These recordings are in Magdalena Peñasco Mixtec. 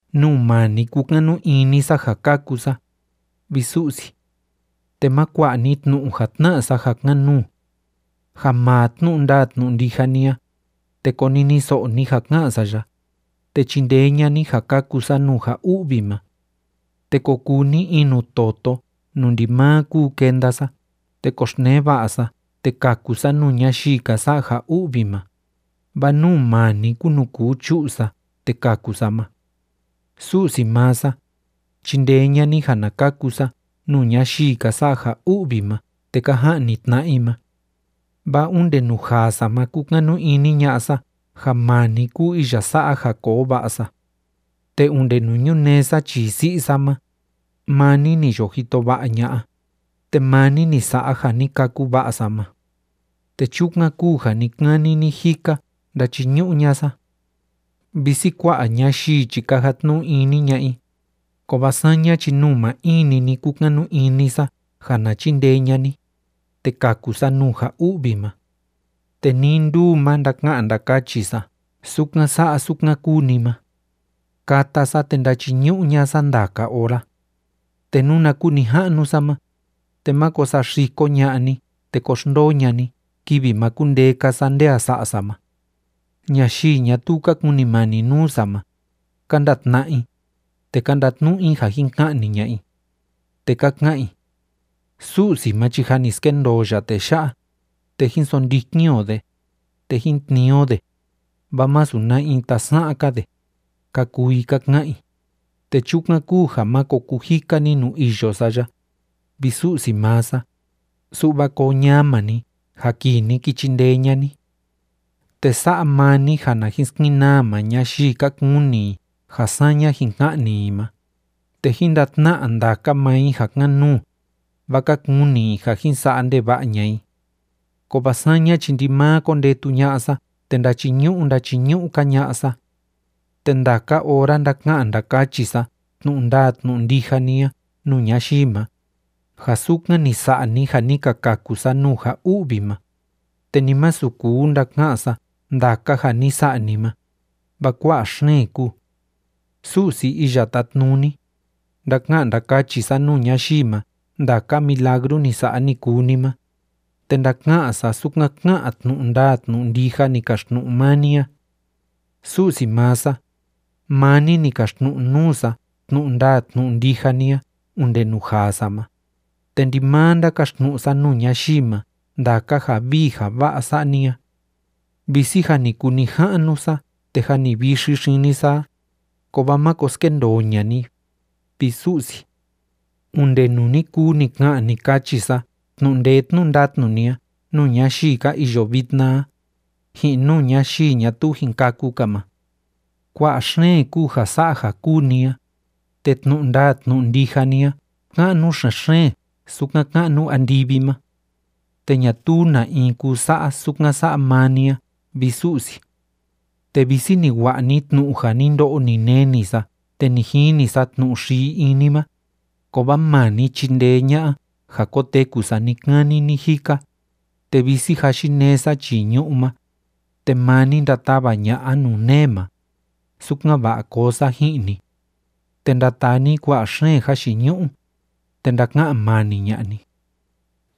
Nuu maa ni kúkanu ini sa ja kaku sa, vi Su'si. Te má kua'a ni tnu'u ja tná'a sa ja kan‑nuu. Ja maa tnu'u ndaa tnu'u ndija ni a, te koniniso'o ni ja ká'an sa ya, te chindee ña'a ni ja kaku sa nuu ja u'vi ma. Te ko kuu ni in nuu toto nuu ndimaa kuu kenda sa te koxtnee va'a sa te kaku sa nuu ñayii ka sa'a ja u'vi ma, vaa nuu maa ni kúu nuu kuu chu'u sa te kaku sa ma. Su'si maa sa, chindee ña'a ni ja na kaku sa nuu ñayii ka sa'a ja u'vi ma te ka ja'ni tna'a i ma. Vaa onde nuu jaa sa ma kúkanu ini ña'a sa ja maa ni kúu iya sa'a ja koo va'a sa. Te onde nuu ñunee sa chii si'i sa ma, maa ni ni yo jito‑va'a ña'a, te maa ni ni sa'a ja ni kâku va'a sa ma. Te chukan kúu ja ni‑kani ni‑jika ndachiñu'u ña'a sa. Visi kua'a ñayii chi ka jatnu'u ini ña'a i, kovaa saña chi nuu maa in‑ni ni kúkanu ini sa ja na chindee ña'a ni, te kaku sa nuu ja u'vi ma. Te nii nduu ma ndaka'an ndakachi sa sukan sa'a sukan kúu ni ma. Kata sa, te ndachiñu'u ña'a sa ndaka ora. Te nuna kuu nija'nu sa ma, te máko saxiko ña'a ni te ko xndoo ña'a ni kivi ma kundee‑ka sa nde a sa'a sa ma. Ñayii ñatuu ka kunimani nuu sa ma, ka ndatna'a i, te ka ndatnu'u i ja jin ka'ni ña'a i. Te ka ka'an i: “Su'si ma chi jâ ni skendoo ya tee ya'a, te jín sondikin o de, te jín tnii o de, vaa masu na in tasa'an‑ka de”, ka kuu i ka ka'an i. Te chukan kúu ja máko kújika ni nuu iyo sa ya, vi Su'si maa sa, su'va koo ñama ni ja kii ni ki chindee ña'a ni. Te sa'a maa ni ja na jin skenaa maa ñayii ka kuni i ja saña jin ka'ni i ma, te jín ndatna'a ndaka maa i ja kan‑nuu, vaa ka kuni i ja jin sa'a ndeva'a ña'a i. Kovaa saña chi ndimaa kondetu ña'a sa te ndachiñu'u ndachiñu'u‑ka ña'a sa. Te ndaka ora ndaka'an ndakachi sa tnu'u ndaa tnu'u ndija ni a nuu ñayii ma, ja sukan ni sa'a ni ja ni ka kaku sa nuu ja u'vi ma, te ni masu kuu ndaka'an sa ndaka ja ni sa'a ni ma, vaa kua'a xeen kúu. Su'si Iya Tátnuni, ndaka'an ndakachi sa nuu ñayii ma ndaka milagru ni sa'a, ni kuu ni ma, te ndaka'an sa sukan ká'an tnu'u ndaa tnu'u ndija ni kaxtnu'u maa ni a. Su'si maa sa, maa ni ni kaxtnu'u nuu sa tnu'u ndaa tnu'u ndija ni a onde nuu jaa sa ma, te ndimaa ndákaxtnu'u sa nuu ñayii ma ndaka ja vii ja va'a sa'a ni a. Visi jâ ni kuu nija'nu sa te jâ ni vixi xini sa a, kovaa máko skendoo ña'a ni, vi Su'si, onde nú ni kuu ni ka'an, ni kachi sa tnu'u ndee tnu'u ndatnu ni a nuu ñayii ka iyo vitna a, ji'in nuu ñayii ñatuu jin kâku‑ka ma. Kua'a xeen kúu ja sa'a ja kúu ni a, te tnu'u ndaa tnu'u ndija ni a ka'nu xen‑xeen sukan ka'nu andivi ma. Te ñatuu na in kúu sa'a sukan sa'a maa ni a, vi Su'si. Te visi ni wa'a ni tnu'u ja ni ndo'o ni neni sa te ni jini sa tnu'u xii ini ma, kovaa maa ni chindee ña'a ja koteku sa ni‑kani ni‑jika, te visi jâ yinee sa chii ñu'ú ma, te maa ni ndatava ña'a nuu nee ma, sukan‑va'a koo sa ji'in ni. Te ndataa ni kua'a xeen jayiñu'u, te ndaka'an mani ña'a ni.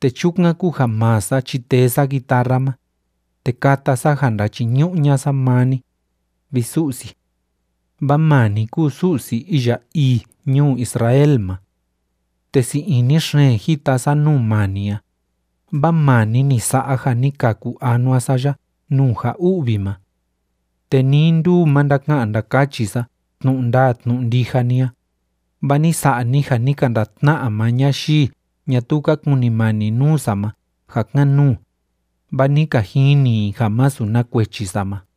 Te chukan kúu ja maa sa chi tee sa guitarra ma, te kata sa ja ndachiñu'u ña'a sa maa ni, vi Su'si, vaa maa ni kúu Su'si iya ii ñuu Israel ma. Te sii ini xeen jita sa nuu maa ni a, vaa maa ni ni sa'a ja ni kaku anua sa ya nuu ja u'vi ma. Te nii nduu ma ndaka'an ndakachi sa tnu'u ndaa tnu'u ndija ni a, vaa ni sa'a ni ja ni ka ndatna'a maa ñayii ñatuu ka kunimani nuu sa ma ja kan‑nuu, vaa ni ka jini i ja masu na kuechi sa ma.